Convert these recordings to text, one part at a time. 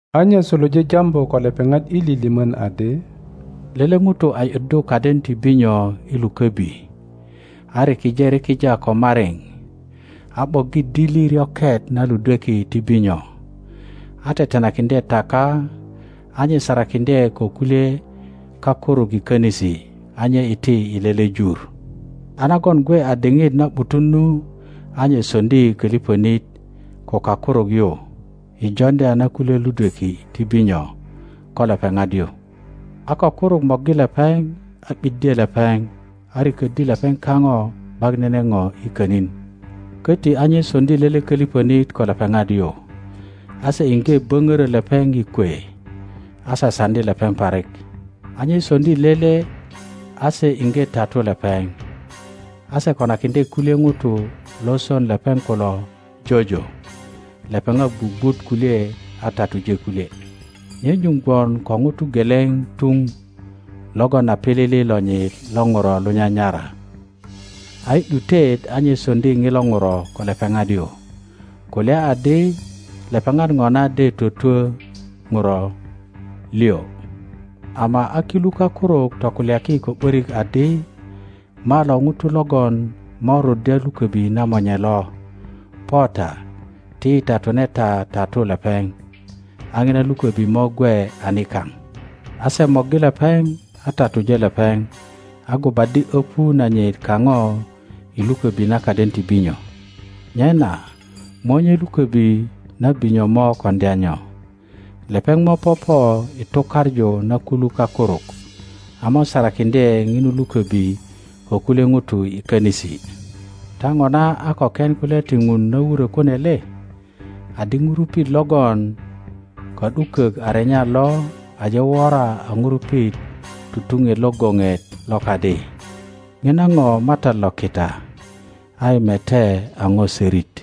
A nye suluje jambu ko lepeŋat i lilimön adi, Lele ŋuto a ’yuddu kaden ti binyo i lukobi, a rikije rikija ko mariŋ, a ’boggi dili ryoket na ludweki ti binyo, a tetenakiŋdye taka, a nye sarakiŋdye ko kulye kakuruk i konisi, a nye iti i lele jur. A nagon gwe a diŋit na ’butun nu, a nye soŋdi kölipönit ko kakuruk yu i joŋdya na kulye ludweki ti binyo ko lepeŋat yu. A kakuruk morgi lepeŋ a ’biddye lepeŋ, a riköddi lepeŋ kaŋo ’bak nene ŋo i könin. Köti a nye soŋdi lele kölipönit ko lepeŋat yu, a se iŋge böŋörö lepeŋ i kwe, a sasaŋdi lepeŋ parik. A nye soŋdi lele a se iŋge tatu lepeŋ; a se konakiŋdye kulye ŋutu lo son lepeŋ kulo jojo, lepeŋat gwugwut kulye, a tatuje kulye. Nye nyuŋ gwon ko ŋuto geleŋ tuŋ logon a pilili lonyit lo Ŋuro lo nyanyara; a i ’dutet a nye soŋdi ŋilo Ŋuro ko lepeŋat yu, kulya adi, Lepeŋat ŋona de twötwö Ŋuro liŋ. Ama a kilu kakuruk tokulyaki ko ’börik adi, Malo ŋuto logon mo ruddya lukobi na monye lo. Po ta, ti yi tatune ta tatu lepeŋ, a ŋina lukobi mo gwe a nikaŋ. A se morgi lepeŋ, a tatuje lepeŋ, a gubaddi öpu nanyit kaŋo i luköbi na kaden ti binyo. Nyena monye luköbi na binyo mo koŋdya nyo? Lepeŋ mo popo i tukaŋu na kulu kakuruk, a mo sarakiŋdye ŋinu lukobi ko kulye ŋutu i könisi. Ta ŋona a ko ken kulya ti Ŋun na wurö kune le? Adi, Ŋurupit logon ka ’dukök a renya lo aje wora a ŋurupit tutuŋet lo goŋet lo kadi. Ŋina ŋo MATAT lo kita; a yi mete a ŋo sorit.,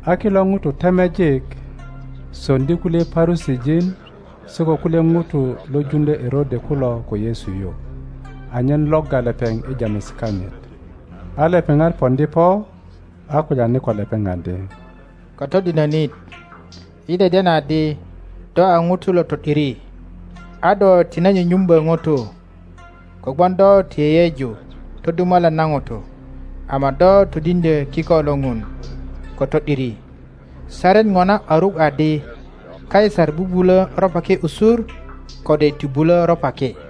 A kilo ŋutu temejik soŋdi kulye Parusijin se ko kulye ŋutu lo juŋdyö Erode kulo ko Yesu yu, anyen logga lepeŋ i jamesi kanyit. a lepeŋat poŋdi po a kulyani ko lepeŋ adi, Katodinönit, yi deden adi do a ŋuto lo to ’diri, a do tine nyunyumbö ŋutu; kogwon do ti yeyeju todumalan na ŋutu, ama do todiŋdyö kiko lo Ŋun ko to ’diri. Saret ŋona a ruk adi Kaisar bubulö ropaki usur, kode ti bulö ropaki?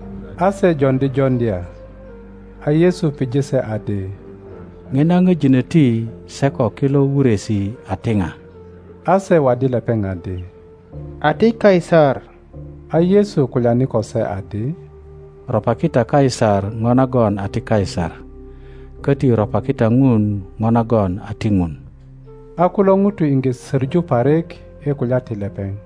A se joŋdi joŋdya. A Yesu pije se adi, Ŋina ŋöjinoti se ko kilo wuresi a ti ŋa? A se waddi lepeŋ adi, A ti Kaisar. a Yesu kulyani ko se adi, Ropaki ta Kaisar ŋo nagon a ti Kaisar, köti ropaki ta Ŋun ŋo nagon a ti Ŋun. A kulo ŋutu iŋge soŋu parik i kulya ti lepeŋ.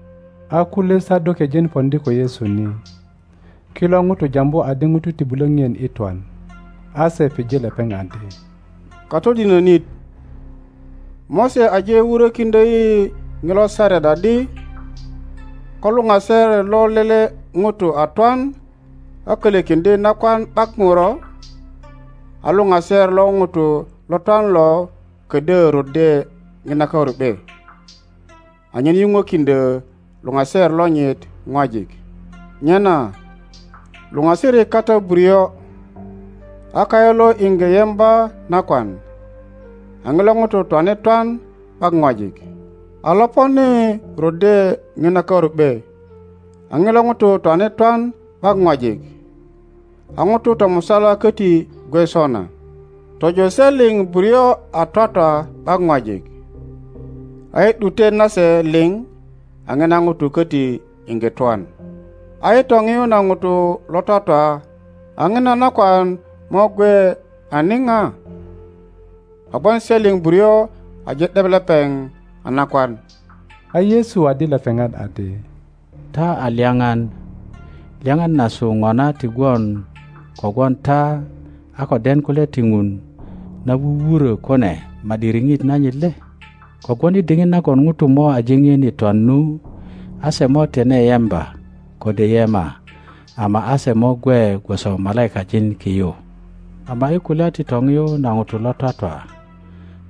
A kulye Sadokejin poŋdi ko Yesu ni. (Kilo ŋutu jambu adi ŋutu ti bulö ŋien i twan.) A se pije lepeŋ adi, Katodinönit, Mose aje wurökiŋdyo yi ŋilo saret adi, Ko luŋaser lo lele ŋuto a tw ’an a kölökiŋdye nakwan ’bak Ŋuro, a luŋaser lo ŋuto lo twan lo kodyö ruddye ŋina karu ’be, anyen yuŋwekiŋdyo luŋaser lonyit ŋwajik. Nyana luŋasirik kata buryo, a kayu lo iŋge yemba nakwan, a ŋilo ŋuto twane twan ’bak ŋwajik. a loponi ruddye ŋina karu ’be, a ŋilo ŋuto twane twan ’bak ŋwajik. A ŋuto tomusala köti gwe sona; tojo se liŋ buryo a twatwa ’bak ŋwajik. A i ’dutet nase liŋ a ŋina ŋuto köti iŋge twan. a i toŋiu na ŋutu lo twatwa a ŋina nakwan mo gwe a niŋa? Kogwon se liŋ buryo aje ’debba lepeŋ a nakwan. A Yesu waddi lepeŋat adi, Ta a lyaŋan. Lyaŋan nasu ŋona ti gwon kogwon ta a ko den kulya ti Ŋun na wuwurö kune ma ’di riŋit nanyit le? Kogwon i diŋit nagon ŋutu mo aje ŋien i twan nu, a se mo tine yemba kode yema, ama a se mo gwe gwoso malaikajin ki yu. Ama i kulya ti toŋiyu na ŋutu lo twatwa,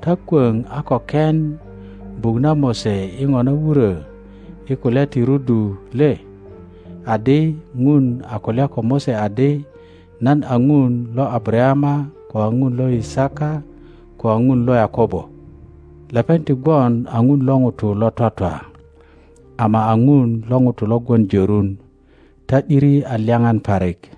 ta kwoŋ a ko ken buk na Mose i ŋo na wurö i kulya ti rudu le? Adi, Ŋun a kulya ko Mose adi, Nan a Ŋun lo Abarayama, ko a Ŋun lo Yisaka, ko a Ŋun lo Yakobo. Lepeŋ ti gwon a Ŋun lo ŋutu lo twatwa, ama a Ŋun lo ŋutu lo gwon jörun; ta ’diri a lyaŋan parik.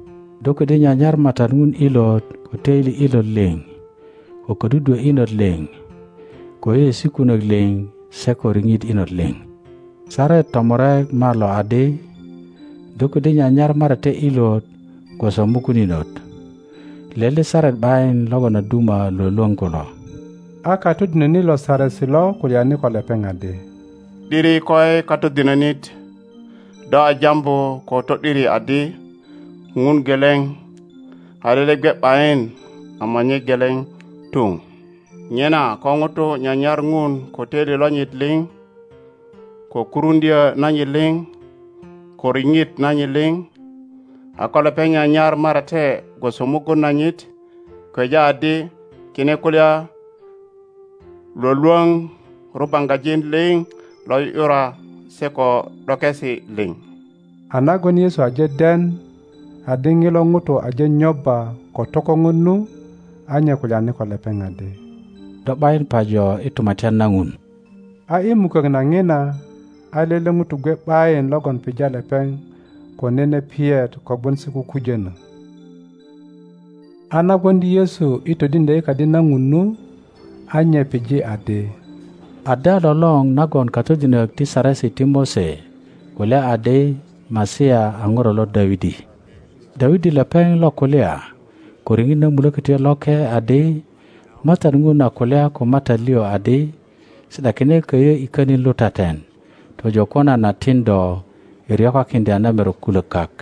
do ködyö nyanyar MATAT Ŋun ilot ko toili ilot liŋ, ko ködudwö inot liŋ, ko yeyeesi kunök liŋ, se ko riŋit inot liŋ. Saret tomurek malo adi, Do kodyö nyanyar marate ilot gwoso mugun inot. Lele saret ’bayin logon a duma lwölwöŋ kulo. A katodinönit lo Saresi lo kulyani ko lepeŋ adi, ’Diri koi Katodinönit; do a jambu ko to ’diri adi Ŋun geleŋ, a lele gwe ’bayin ama nye geleŋ tuŋ. Nyena ko ŋuto nyanyar Ŋun ko töili lonyit liŋ, ko kuruŋdyö nanyit liŋ, ko riŋit nanyit liŋ, a ko lepeŋ nyanyar marate gwoso mugun nanyit, kweja adi kine kulya lwölwöŋ rubaŋgajin liŋ lo ’yu ’yura se ko ’dokesi liŋ. A nagon Yesu aje den adi ŋilo ŋuto aje nyobba ko tokoŋon nu, a nye kulyani ko lepeŋ adi, Do ’bayin pajo i Tumatyan na Ŋun. A i mukök na ŋina a lele ŋuto gwe ’bayin logon pija lepeŋ ko nene piyet kogwon se kukujönö. A na gwoŋdi Yesu i todiŋdyo i Kadi na Ŋun nu, a nye pije adi, Ada lolor nagon katodinök ti Saresi ti Mose kulya adi Masia a Ŋuro lo Dawidi? Dawidi lepeŋ lo kulya ko riŋit na Mulokötyo Loke adi, MATAT Ŋun a kulya ko MATAT liŋ adi, Si ’dakine köyö i könin lutaten, tojo ko nan a tin do i ryokakiŋdya na merok kulök kak.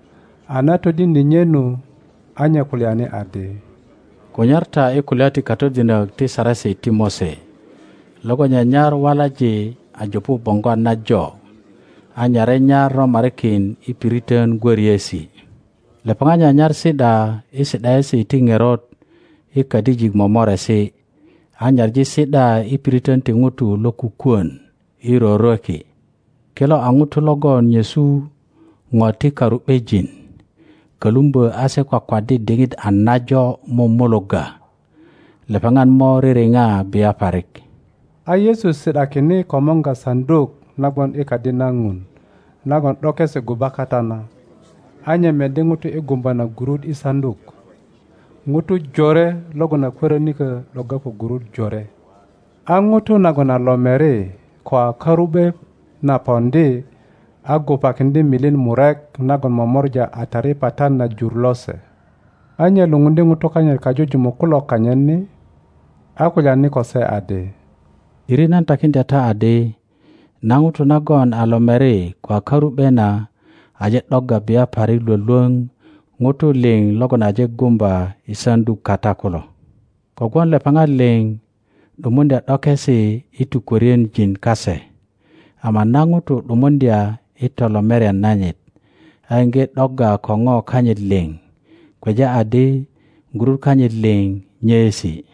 a na todiŋdye nye nu, a nye kulyani adi, Kunyar ta i kulya ti katodinök ti Saresi ti Mose logon nyanyar walaŋ a jupu boŋgwat najo a nyare nyar romarikin i piritön gwöriesi. Lepeŋat nyanyar si ’da i si ’daesi ti ŋerot i kadijik momoresi, a nyaŋi si ’da i piritön ti ŋutu lo kukwön i rorweki. Kilo a ŋutu logon nyesu ŋo ti karu ’bejin, kölumbö a se kwakwaddi diŋit a najo mumulugga. Lepeŋat mo ririŋa bia parik. A Yesu si ’dani komorga saŋduk na gwon i Kadi na Ŋun nagon ’dokesi guba kata na, a nye meddi ŋutu i gumba na gurut i saŋduk ŋutu jore logon a kwörinikö ’dogga ko gurut jore. A ŋuto nagon a lomeri ko a karu ’be na poŋdi, a gubakiŋdye milin murek nagon momora a taripatat na jur lose. A nye lupundye ŋutu kanyit kajujumuk kulo kanyit ni, a kulyani ko se adi, ’Diri nan takiŋdya ta adi, na ŋuto nagon a lomeri ko a karu ’be na aje ’dogga bia parik lwölwöŋ ŋutu liŋ logon aje gumba i saŋduk kata kulo. Kogwon lepeŋat liŋ ’dumuŋdya ’dokesi i tukwörienjin kase; ama na ŋuto ’dumuŋdya i tolomerian nanyit, a iŋge ’dogga ko ŋo kanyit liŋ, kweja adi gurut kanyit liŋ nyeesi.